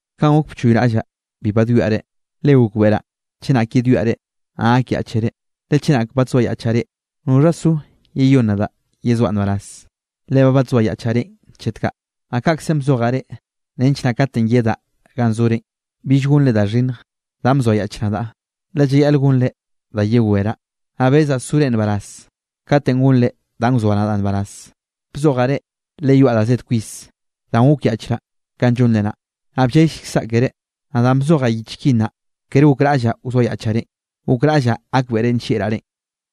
Kanꞌ gok bchoyraꞌllaꞌ bi badwiaꞌ reꞌ, le gokbeꞌraꞌ chenak yedwiaꞌ reꞌ, naꞌ gakyaꞌchere. Le chenak badzoayaꞌchaꞌ reꞌ, ¿noxha zo yeyón nadaꞌ yezoaꞌ nbaraz? Le ba badzoayaꞌchaꞌ reꞌn chet kaꞌ. Naꞌ kaꞌkzenꞌ bzojaꞌ reꞌ nench naꞌ katenꞌ yedaꞌ ganꞌ zorenꞌ, bill gonre da xhinnj danꞌ bzoayaꞌch nadaꞌ, le llayaꞌl gonre da yeweraꞌ. Naꞌ bezaꞌ sore nbaraz katenꞌ gonre danꞌ wzoa nadaꞌ nbaraz. Bzojaꞌ reꞌ, le yoaꞌ da zed kwis, danꞌ gokyaꞌchraꞌ kanꞌ llonre naꞌ, naꞌ bllellkzaꞌ keré. Naꞌ danꞌ bzojaꞌ yich ki naꞌ, kere gokraꞌllaꞌ wzoayaꞌchaꞌ reꞌn, gokraꞌllaꞌ gakbeꞌre nllieꞌraꞌ reꞌn.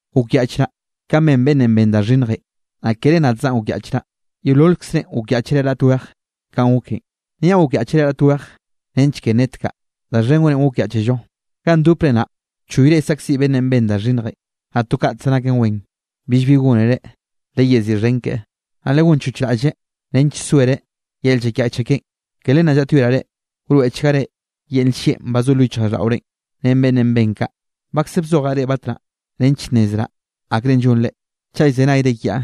Gokyaꞌchraꞌ kanꞌ ben beꞌnnenꞌ ben da xhinnjenꞌ, naꞌ kere nadzaꞌn gokyaꞌchraꞌ. Yeololkzrenꞌ gokyaꞌchere raꞌt weje kanꞌ goken. Niaꞌ gokyaꞌchere raꞌt weje nench ke nnetkaꞌ da xhen gorenꞌ gokyaꞌchello. Ganꞌ ndopre naꞌ bchoyre saꞌkziꞌ beꞌnnenꞌ ben da xhinnjenꞌ, naꞌ to kaꞌtze naken wenꞌ. Billbi gónereꞌ, leyeziꞌxhen keꞌe, naꞌ legonchoch raꞌlleꞌ nench soereꞌ yel llakyaꞌche keꞌen. Ke len naꞌ llaꞌtyoeraꞌ reꞌ, wroeꞌchgare yel nllieꞌn ba zo lo yichjraꞌlldaꞌorenꞌ ren beꞌnnenꞌ ben kaꞌ. Bakze bzojaꞌ reꞌ batnaꞌ nench nnezraꞌ akrenꞌ llonre, chaꞌ llzenayre kiaꞌ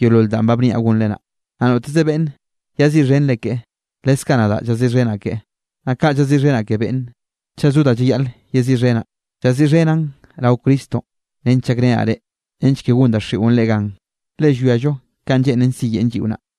yeolol danꞌ ba bniaꞌ gonre naꞌ. Naꞌ noteze beꞌnne llaziꞌxhenre keꞌe, leskaꞌ nadaꞌ llaziꞌxhenaꞌ keꞌe. Naꞌ kaꞌ llaziꞌxhenaꞌ ke beꞌnne, chaꞌ zo da llayaꞌl yeziꞌxhenaꞌ, llaziꞌxhenaꞌn rao Cristonꞌ nench llakrenaꞌ reꞌ, nench ke gon daxiꞌon reꞌ gan, le llwiallo kanꞌ lleꞌnen siyeꞌn lliꞌo naꞌ.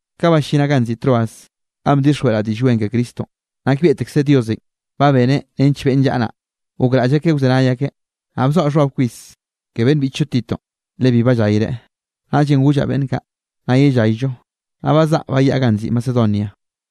Ka bllinaꞌ ganꞌ nziꞌi Troas ganꞌ bdixjweꞌraꞌ Diꞌll Wen ke Cristonꞌ, nakbieꞌtekze Diosenꞌ ba beneꞌ nench beꞌnn llaꞌa naꞌ, gokraꞌll akeꞌ wzenay akeꞌ. Naꞌ bzoaꞌ xhbab kwis ke beꞌnn biꞌchllo Titonꞌ le bi ballayreꞌ. Naꞌllenꞌ gollaꞌ beꞌnn kaꞌ: “Nna yellayllo”, naꞌ bazaꞌa bayaꞌa ganꞌ nziꞌi Macedonia.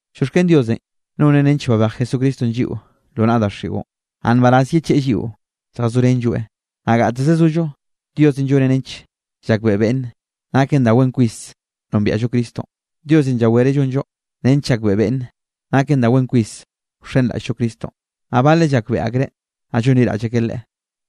Llioxken Diosenꞌ, noneꞌ nench babej Jesucristonꞌ lliꞌo lo naꞌa daxiꞌon, naꞌ nbaraz yecheꞌe lliꞌo lljazorenlloeꞌ. Naꞌ gateze zollo Diosenꞌ lloneꞌ nench llakbeꞌe beꞌnne, naken da wen kwis nombiaꞌllo Cristonꞌ. Diosenꞌ llawereꞌ llonllo nench llakbeꞌe beꞌnne naken da wen kwis wxenraꞌll-llo Cristonꞌ. Naꞌ baleꞌ llakbeꞌe akreꞌ naꞌ llonliraꞌll akeꞌ Leꞌe,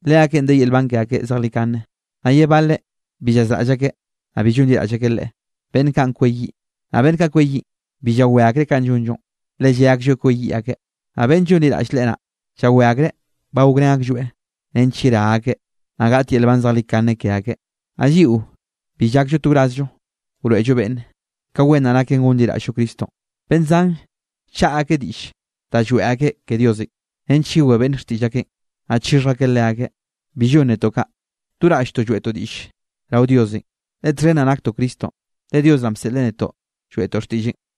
leakeꞌn de yel nban ke akeꞌ zejlikane, naꞌ ye baleꞌ bi llayazraꞌll akeꞌ, naꞌ bi llonliraꞌll akeꞌ Leꞌe, beꞌnn kaꞌn kweyiꞌ. Naꞌ beꞌnn kaꞌ kweyiꞌn, bi llawé akreꞌ kanꞌ llonllonꞌ, le lle aklloeꞌ kweyiꞌ akeꞌ. Naꞌ beꞌnn llonliraꞌll Leꞌe naꞌ, llawé akreꞌ ba gokrén aklloeꞌ nench yerá akeꞌ, naꞌ gaꞌt yel nban zejlikane ke akeꞌ. Naꞌ lliꞌo bi llakllo to wrazllo wroeꞌllo beꞌnne, ka wen naꞌ naken gonliraꞌll-llo Cristonꞌ. Beꞌnn zan llchaꞌa akeꞌ diꞌll da lloeꞌ akeꞌ ke Diosenꞌ nench yewé beꞌnne xtiꞌll akeꞌn, naꞌ chixhj akeꞌ leakeꞌ. Bi llon netoꞌ kaꞌ, do raꞌlltoꞌ lloeꞌtoꞌ diꞌll rao Diosenꞌ, le txhen naꞌ naktoꞌ Cristonꞌ le Dios naꞌn bseꞌle netoꞌ lloeꞌtoꞌ xtiꞌlleꞌn.